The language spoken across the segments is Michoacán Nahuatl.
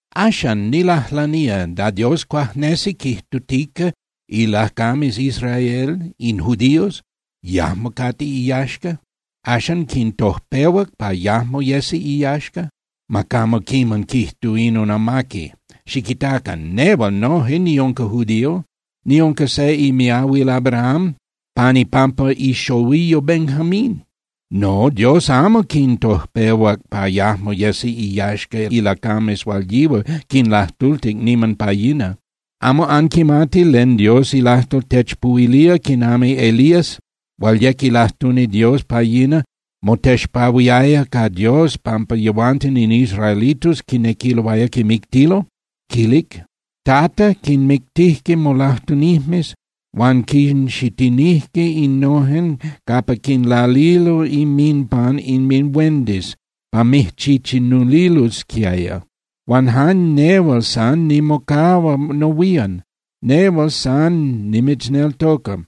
Axan, nilajlanía, ¿da Dios cuajnesi quijtutica ilacames Israel, in judíos, yajmo cate iyaxca? ¿Axan quintojpehuac pa yajmo yesi iyaxca? ¡Ma camo quiman quijtu inon amaqui! Xiquitacan. Nehual noje niunca judío, niunca se imiahuil Abraham pan ipampa ixohuiyo Benjamín. No, Dios amo quintojpehuac pa yajmo yesi iyaxca ilacames hual yihual quinlajtultic niman pa yina. ¿Amo anquimati len Dios ilajtol techpuhuilía quiman Elías, hual yec ilajtuni Dios pa yina, motexpahuiaya ca Dios pampa yehuanten in israelitos quinequiloaya quimictilo? Quilic: “Tata, quinmictijque molajtunijmes huan quinxitinijque innojen capa quinlalilo inminpan inminhuendis pa mijchichinulilosquiaya. Huan jan nehual san nimocahua nohuían, nehual san nimitzneltoca,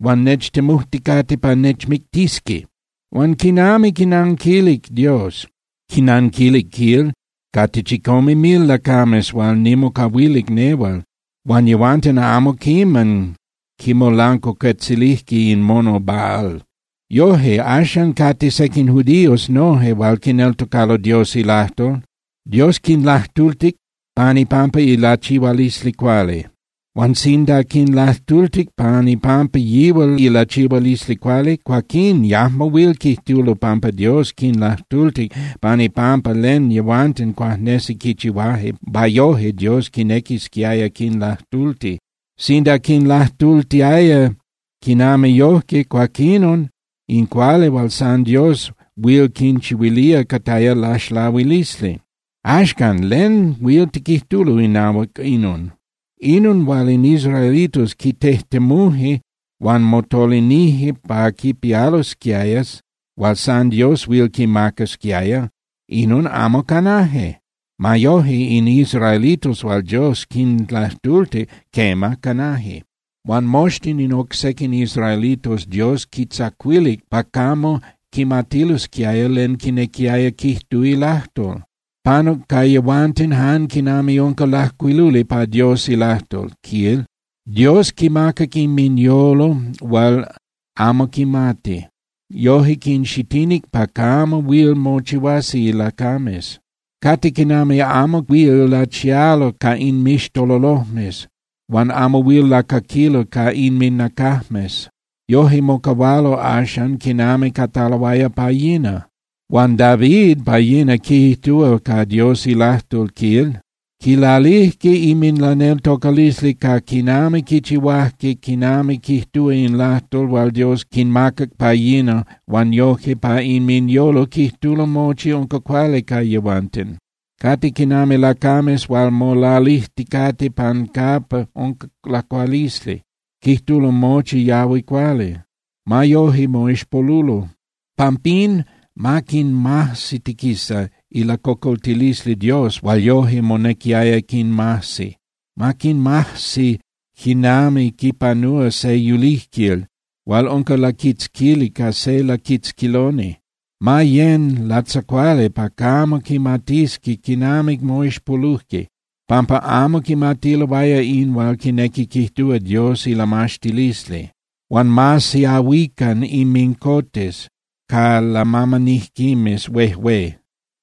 huan nechtemujticate pa nechmictisqui.” Huan ¿quinami quinanquilic Dios? Quinanquilic, quil: “Cate chicome mil lacames hual nimocahuilic nehual, huan yehuanten amo quiman quimolancuacuetzilijque in mono Baal.” Yoje, axan cate sequin judíos noje hual quineltocalo Dios ilajtol, Dios quinlajtultic pan ipampa ilachihualisli cuali. Huan sinda quinlajtultic pan ipampa yihual ilachihualisli cuali, cuaquín yajmo huil quijtulo pampa Dios quinlajtultic pan ipampa len yehuanten cuajnesi quichihuaje pa yoje Dios quinequisquiaya quinlajtulti. Sinda quinlajtultiaya quinami yojque, cuaquinon in cuali hual san Dios huil quinchihuilía cataya laxlahuilisli. Axcan, ¿len huil tiquijtulo inahuac inon? Inon hual in israelitos quitejtemuje huan motolinije pa quipialosquiaya hual san Dios huil quimacasquiaya, inon amo canaje. Ma yoje, in israelitos hual Dios quinlajtultic, quema, canaje. Huan moxtin in oc sequin israelitos Dios quintzacuilic pa camo quimatilosquiaya len quinequiaya quijtu ilajtol. Panuc ca yehuanten jan quinami unca lajcuiluli pa Dios ilajtol, quil: “Dios quinmacac inminyolo hual amo quimati. Yoje quinxitinic pa camo huil mochihuasi ilacames. Cate quinami amo huil lachialo ca inmixtololojmes huan amo huil lacaquilo ca innacajmes. Yoje mocahualo axan quinami cataloaya pa yina.” Huan David pa yina quijtúa ca Dios ilajtol, quil: Quilalijque inminlaneltocalisli ca quinami quichihuajque quinami quijtúa in lajtol hual Dios quinmacac pa yina huan yojque pa inminyolo quijtulo mochi unca cuali ca yehuanten. Cate quinami lacames hual molalijticate pan capa unca lacualisli, quijtulo mochi yahui cuali. Ma yoje, moixpolulo. Pampín ma quinmajsitiquisa ilacocoltilisli Dios hual yoje monequiaya quinmajsi. Ma quinmajsi quinami quipanúa se yulijquil hual unca laquitzquili ca se laquitzquiloni. Ma yén (yecan) latzacuali pa camo quimatisqui quinami moixpolujque, pampa amo quimatiloaya in hual quinequi quijtúa Dios ilamaxtilisli. Huan ma siahuican inmincotes ca lamamanijquimes huejué.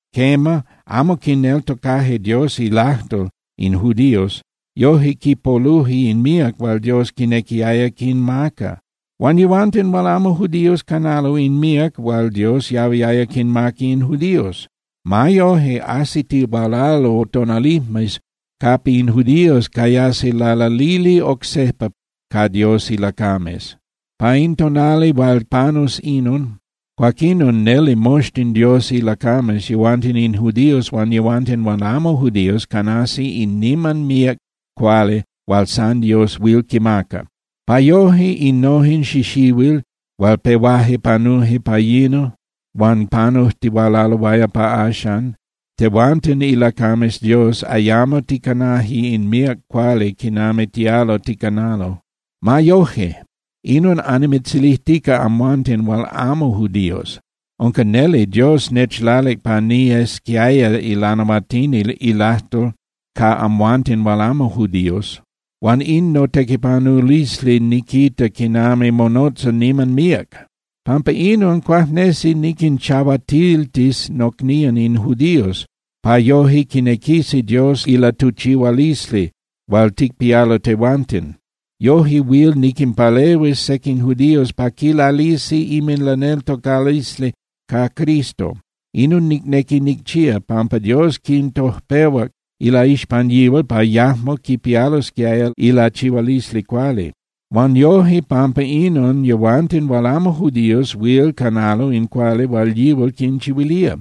Quema, amo quineltocaje Dios ilajtol in judíos, yoje quipoluje in míac hual Dios quinequiaya quinmaca. Huan yehuanten hual amo judíos canalo in míac hual Dios yahuiaya quinmaca in judíos. Ma yoje, ajsitihualalo tonalijmes capa in judíos cayasi lalalili oc sejpa ca Dios ilacames. Pa in tonali hual panus inon, cuaquinon neli moxtin Dios ilacames, yehuanten in judíos huan yehuanten hual amo judíos, canasi in niman míac cuali hual san Dios huil quimaca. Pa mochi innojen xixihuil hual pehuaje panuje pa yina huan panujtihualaloaya pa axan, tehuanten ilacames Dios ayamo ticanaje in míac cuali quinami tialo ticanalo. Ma yoje, inon annimitzilijtica amhuanten hual amo judíos. Unca neli Dios nechlalic pa niyesquiaya ilanahuatini ilajtol ca amhuanten hual amo judíos. Huan in notequipanulisli niquita quinami monotza niman míac. Pampa inon, cuajnesi niquinchahuatiltis nocnían in judíos, pa yoje quinequisi Dios ilatuchihualisli hual ticpialo tehuanten. Yoje huil niquinpalehuis sequin judíos pa quilalisi inminlaneltocalisli ca Cristo. Inon nicnequi nicchía, pampa Dios quintojpehuac ilaixpan yihual pa yajmo quipialosquiaya ilachihualisli cuali. Huan yoje pampa inon yehuanten hual amo judíos huil canalo in cuali hual yihual quinchihuilía.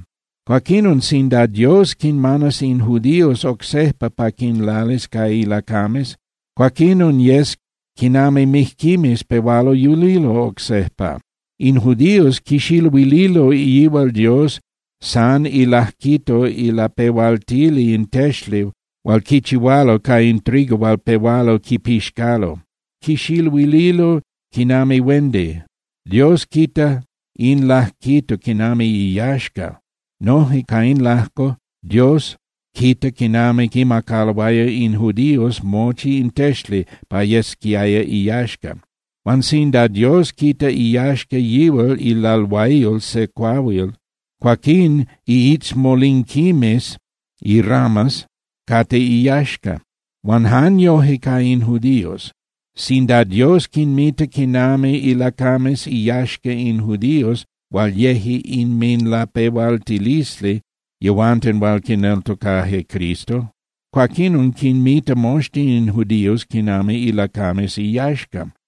Cuaquinon sinda Dios quinmanas in judíos oc sejpa pa quinlalis ca ilacames, cuaquinon yes quinami mijquimes pehualo yulilo oc sejpa. In judíos quixiluililo yihual Dios san ilajquito ilapehualtili in texli hual quichihualo ca in trigo hual pehualo quipixcalo. Quixiluililo quinami huendi. Dios quita in lajquito quinami iyaxca. Noje ca in lajco Dios quita quinami quimacaloaya in judíos mochi in texli pa yesquiaya iyaxca. Huan sinda Dios quita iyaxca yihual ilalhuayol se cuahuil, cuaquín iitzmolinquimes (iramas) cate iyaxca. Huan jan yoje ca in judíos. Sinda Dios quinmita quinami ilacames iyaxca in judíos hual yeje inminlapehualtilisli yehuanten hual quineltocaje Cristo, cuaquinon quinmita moxtin in judíos quinami ilacames iyaxca.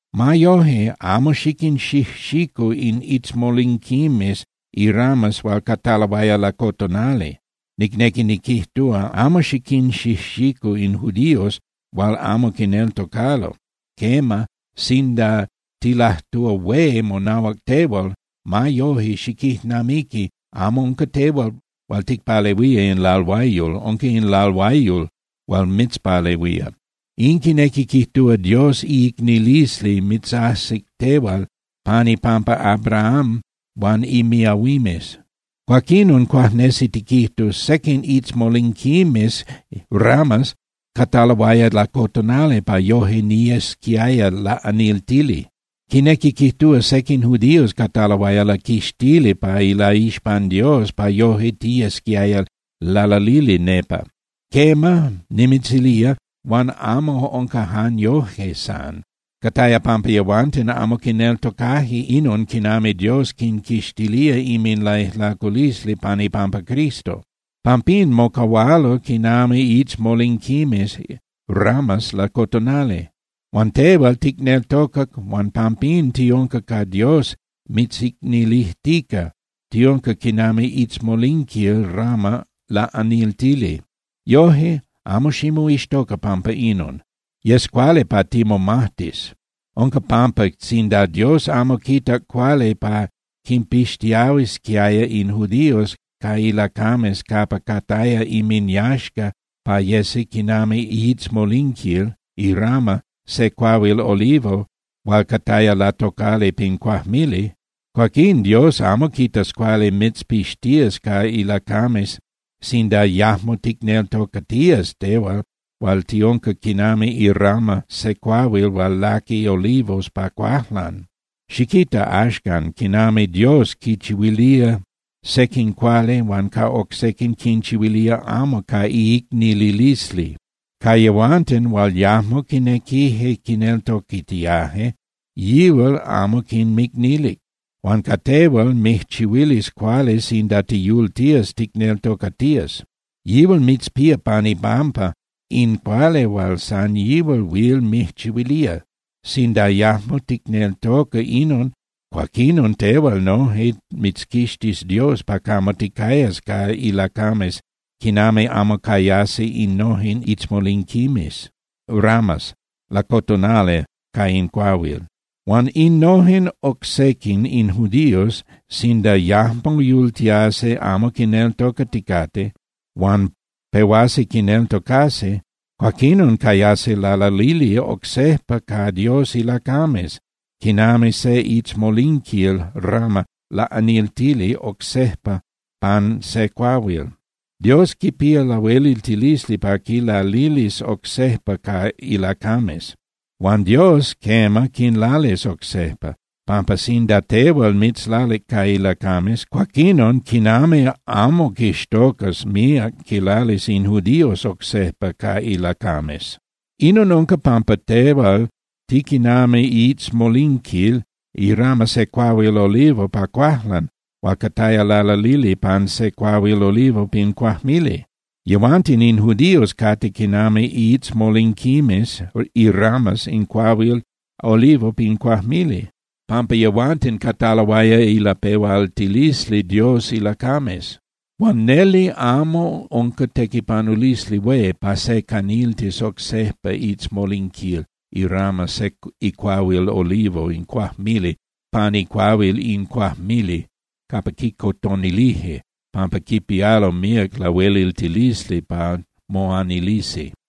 Ma yoje, amo xiquinxijxicu in itzmolinquimes (ramas) hual cataloaya lacotonali, nicnequi niquijtúa, amo xiquinxijxicu in judíos hual amo quineltocalo. Quema, sinda tilajtúa hué monahuac tehual, ma yoje, xiquijnamiqui amo unca tehual hual ticpalehuía in lalhuayol, unca in lalhuayol hual mitzpalehuía. In quinequi quijtúa Dios iicnililisli mitzajsic tehual pan ipampa Abraham huan imiahuimes. Cuaquinon cuajnesi tiquijtus: “Sequin itzmolinquimes (ramas) cataloaya lacotonali pa yoje niyesquiaya laꞌaniltili.” Quinequi quijtúa sequin judíos cataloaya laquixtili pa ilaixpan Dios pa yoje tiyesquiaya lalalili nepa. Quema, nimitzilía, huan amo unca jan yoje san. Cataya pampa yehuanten amo quineltocaje inon quinami Dios quinquixtilía inminlaijlaculisli pan ipampa Cristo. Pampín mocahualo quinami itzmolinquimes (ramas) lacotonali. Huan tehual ticneltocac huan pampín tiunca ca Dios mitzicnilijtica, tiunca quinami itzmolinquil (rama) laꞌaniltili. Yoje, amo ximoixtoca pampa inon. Yes cuali pa timomajtis. Unca pampa sinda Dios amo quitac cuali pa quinpixtiahuisquiaya in judíos ca ilacames capa cataya inminyaxca pa yesi quinami iitzmolinquil (irama) se cuahuil olivo hual cataya latocali pin cuajmili, cuaquín Dios amo quitas cuali mitzpixtías ca ilacames sinda yajmo ticneltocatías tehual hual tiunca quinami irama se cuahuil hual laqui olivos pa cuajlan. Xiquita, axcan, quinami Dios quinchihuilía sequin cuali huan ca oc sequin quinchihuilía amo ca iicnililisli. Ca yehuanten hual yajmo quinequije quineltocatiaje, yihual amo quinmicnilic. Huan ca tehual mijchihuilis cuali sinda tiyultías ticneltocatías. Yihual mitzpía pan ipampa in cuali hual san yihual huil mijchihuilía. Sinda yajmo ticneltoca inon, cuaquinon tehual noje mitzquixtis Dios pa camo ticayas ca ilacames quinami amo cayasi innojen itzmolinquimes (ramas) lacotonali ca in cuahuil. Huan innojen oc sequin, in judíos, sinda yajmo yultiasi amo quineltocaticate, huan pehuasi quineltocasi, cuaquinon cayasi lalalili oc sejpa ca Dios ilacames, quinami se itzmolinquil (rama) laꞌaniltili oc sejpa pan se cuahuil. Dios quipía lahueliltilisli pa quilalilis oc sejpa ca ilacames. Huan Dios, quema, quinlalis oc sejpa, pampa sinda tehual mitzlalic ca ilacames, cuaquinon ¡quinami amo quixtocas míac quinlalis in judíos oc sejpa ca ilacames! Inon unca pampa tehual tiquinami iitzmolinquil (irama) se cuahuil olivo pa cuajlan hual cataya lalalili pan se cuahuil olivo pin cuajmili. Yehuanten in judíos cate quinami iitzmolinquimes (iramas) in cuahuil olivo pin cuajmili, pampa yehuanten cataloaya ilapehualtilisli Dios ilacames. Huan neli amo unca tequipanulisli hué pa se caniltis oc sejpa iitzmolinquil (irama) se icuahuil olivo in cuajmili pan icuahuil in cuajmili capa quicotonilije, pampa quipialo míac lahueliltilisli pa moanilisi.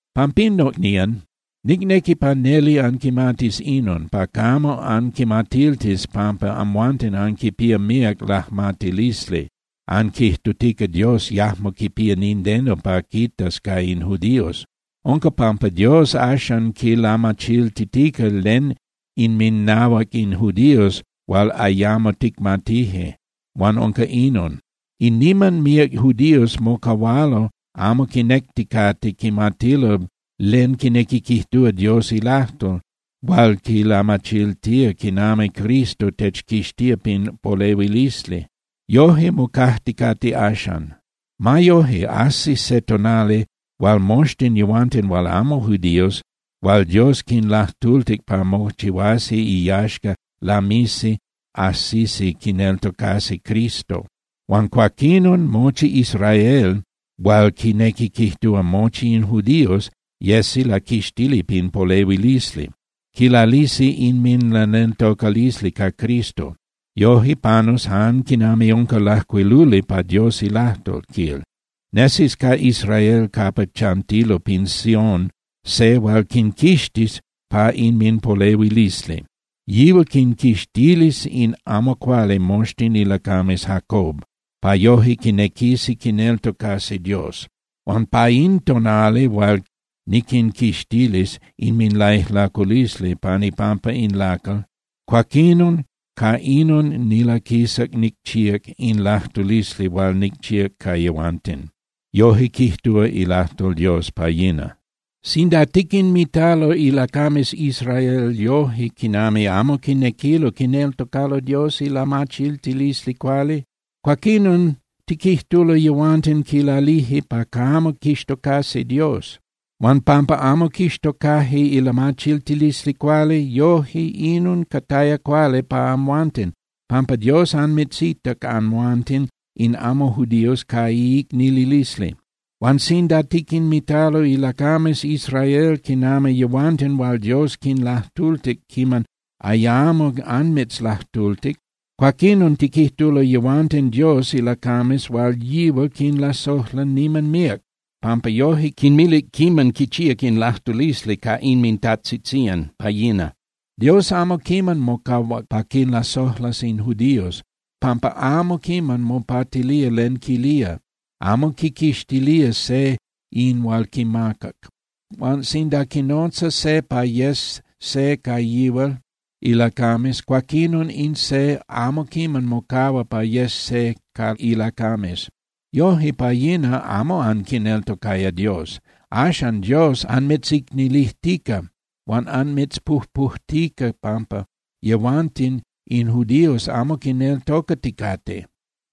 Pampín, nocnían, nicnequi pa neli anquimatis inon, pa camo anquimatiltis pampa amhuanten anquipía míac lajmatilisli, anquijtutica Dios yajmo quipía nindeno pa quitas ca in judíos. Unca pampa Dios axan quilamachiltitica len inminahuac in judíos hual ayamo ticmatije, huan unca inon: In niman míac judíos mocahualo amo quinecticate quimatilo len quinequi quijtúa Dios ilajtol hual quilamachiltía quinami Cristo techquixtía pin polehuilisli. Yoje mocajticate axan. Ma yoje, ajsis se tonali hual moxtin yehuanten hual amo judíos hual Dios quinlajtultic pa mochihuasi iyaxca lamisi ajsisi quineltocasi Cristo. Huan cuaquinon, mochi Israel, hual quinequi quijtúa mochi in judíos, yesi laquixtili pin polehuilisli, quilalisi inminlaneltocalisli ca Cristo. Yoje panus jan quinami unca lajcuiluli pa Dios ilajtol, quil: Nesis ca Israel capa chantilo pin Sión, se hual quinquixtis pa inminpolehuilisli. Yihual quinquixtilis in amo cuali moxtin ilacames Jacob, pa yoje quinequisi quineltocasi Dios. Huan pa in tonali hual niquinquixtilis inminlaijlaculisli pan ipampa in lacal, cuaquinon ca inon nilaquisac nicchíac in lajtulisli hual nicchíac ca yehuanten. Yoje quijtúa ilajtol Dios pa yina. Sinda tiquinmitalo ilacames Israel yoje quinami amo quinequilo quineltocalo Dios ilamachiltilisli cuali, cuaquinon tiquijtulo yehuanten quilalije pa camo quixtocasi Dios. Huan pampa amo quixtocaje ilamachiltilisli cuali, yoje inon cataya cuali pa amhuanten, pampa Dios anmitzitac amhuanten in amo judíos ca iicnililisli. Huan sinda tiquinmitalo ilacames Israel quinami yehuanten hual Dios quinlajtultic quiman ayamo anmitzlajtultic, cuaquinon tiquijtulo yehuanten Dios ilacames hual yihual quinlasojla niman míac pampa yoje quinmilic quiman quichíac in lajtulisli ca inmintajtzitzían pa yina. Dios amo quiman mocahuac pa quinlasojlas in judíos, pampa amo quiman mopatilía len quilía, amo quiquixtilía se in hual quimacac. Huan sinda quinotza se pa yes se ca yihual ilacames, cuaquinon in se amo quiman mocahua pa yes se ca ilacames. Yoje pa yina amo anquineltocaya Dios. Axan Dios anmitzicnilijtica huan anmitzpujpujtica pampa yehuanten in judíos amo quineltocaticate.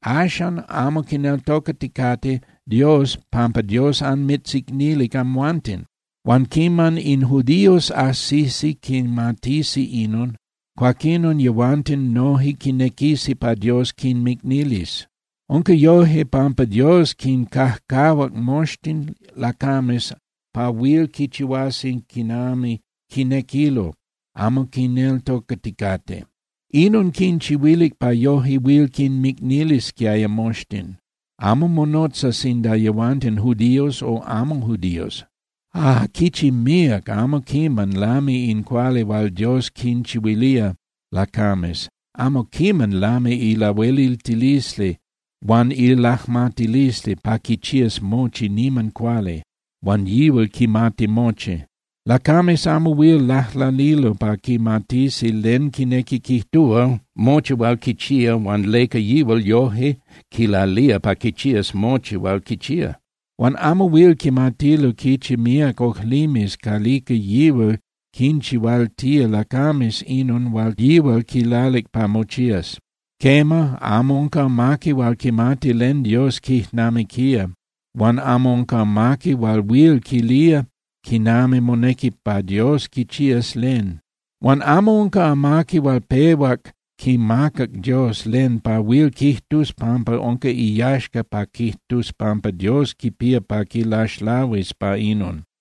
Axan amo quineltocaticate Dios pampa Dios anmitzicnilic amhuanten. Huan quiman in judíos ajsisi quimatisi inon, cuaquinon yehuanten noje quinequisi pa Dios quinmicnilis. Unca yoje pampa Dios quincajcahuac moxtin lacames pa huil quichihuasi quinami quinequilo, amo quineltocaticate. Inon quinchihuilic pa yoje huil quinmicnilisquiaya moxtin, amo monotza sinda yehuanten judíos o amo judíos. Ah, ¡quichi míac, amo quiman lami in cuali hual Dios quinchihuilía lacames! ¡Amo quiman lami ilahueliltilisli huan ilajmatilisli pa quichías mochi niman cuali, huan yihual quimati mochi! Lacames amo huil lajlanilo pa quimatisi len quinequi quijtúa mochi hual quichía huan leca yihual yoje quilalía pa quichías mochi hual quichía. Huan amo huil quimatilo quichi míac ojlimes calica yihual quinchihualtía lacames inon hual yihual quilalic pa mochías. Quema, “amo unca amaqui hual quimatic len Dios quijnamiquía huan amo unca amaqui hual huil quilía quinami monequi pa Dios quichías len. Huan amo unca amaqui hual pehuac quimacac Dios len pa huil quijtus pampa unca iyaxca pa quijtus pampa Dios quipía pa quilaxlahuis pa inon.”